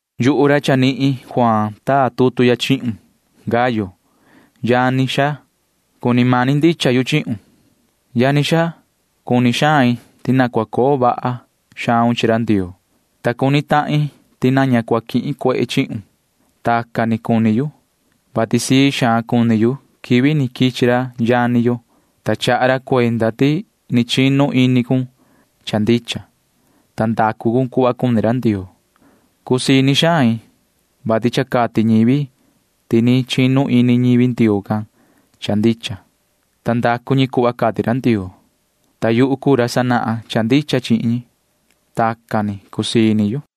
Yuhu ra Juaan ra chanihin taa tutu ya chihun, yoho Gayo, yani xaa, ta cuni mani ndicha yu chihun. Yani xaa, cuni xain ti na cua coo vahun cuhva iyo vahun chi ra Ndioo, ta cuni tahin ti na ña cua quihin cuehe chihun. Tacan ni cuni yu, vati sii xaan cuni yu quivi ni quichi ra yani yo, ta chaha ra cuenda ti ni chinu ini cun cha ndicha, ta ndacu cun cuhva cuni ra Ndioo. Cusii ini xain, vati cha cati ñivi ti ni chinu ini ñivi Ndioo can cha ndicha, ta ndacu ñi cuhva cati ra Ndioo, ta yuhu cuu ra sanahan cha ndicha chihin ñi. Tacan ni cusii ini yu.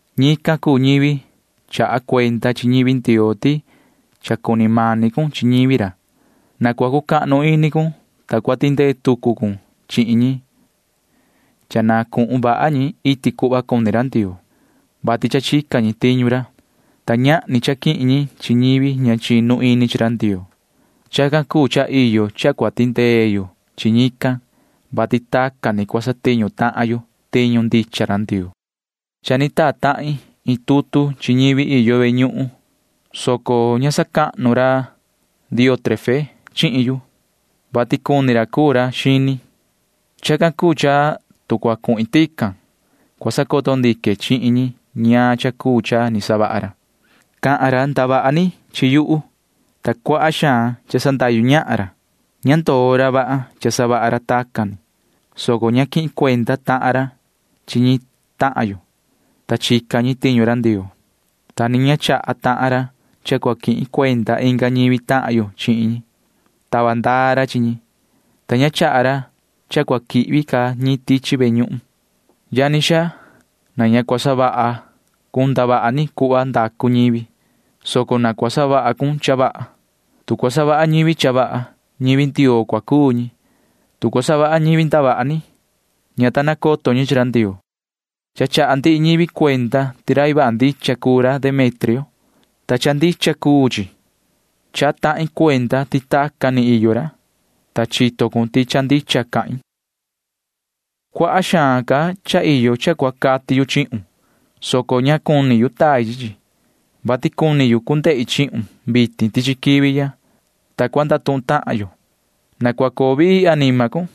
Ñican cuu ñivi chaha cuenda chi ñivi Ndioo ti cha cuni mani cun chi ñivi ra. Na cua cucahnu ini maun cua tindee tucu cun chihin ñi cha na cuhun vaha ñi iti cuhva cuni ra Ndioo, vati cha chica ñi tiñu ra, ta ñahni cha quihin ñi chi ñivi ña chinu ini chi ra Ndioo. Chacan cuu cha iyo cha cua tindee yo chi ñican, vati tacan ni cua satiñu tahan yo tiñu ndicha tiñu ra Ndioo. Cha ni taa tahin iin tutu chi ñivi iyo ve ñuhun, soco ña sacahnu ra Diótrefe chihin yu, vati cuni ra cuu ra xini. Chacan cuu cha tu cua cuhin tican, cua sacoto ndique chihin ñi ñaan cha cuu cha ni savaha ra. Cahan ra ndavaha ni chi yuhu, ta cuaha xaan cha sandahyu ñahan ra. Ña ndoo ra vaha cha savaha ra tacan ni, soco ña quihin cuenda tahan ra chi ñi tahan yo, ta chica ñi tiñu ra Ndioo, ta ni ña chaha tahan ra cha cua quihin cuenda inga ñivi tahan yo chihin ñi. Tava ndaa ra chihin ñi, ta ña chaha ra cha cua quihvi ca ñi tichi ve ñuhun. Yani xaa, na ña cua savaha cun ndavaha ni cuhva ndacu ñivi, soco na cua savaha cun cha vaha. Tu cua savaha ñivi cha vaha, ñivi Ndioo cua cuu ñi. Tu cua savaha ñivi ndavaha ni, ña ta nacoto ñi chi ra Ndioo. Cha chaha ndihi ñivi cuenda ti rai vaha ndicha cuu ra Demetrio, ta cha ndicha cuu chi. Chaha tahin cuenda ti tacan ni iyo ra, ta chito cun ti cahan ndicha yu. Cuaha xaan ca iyo cha cua cati yu chihun, soco ña cuni yu tai chi chi, vati cuni yu cu ndehi chihun vitin tichi quivi ya, ta cua ndatuhun tahan yo. Na cua coo vii anima cun.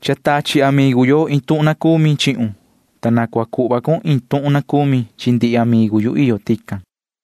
Cha tachi amigu yo iin tuhun na cumi chihun, ta na cua cati cun iin tuhun na cumi chi ndihi amigu yu iyo tican.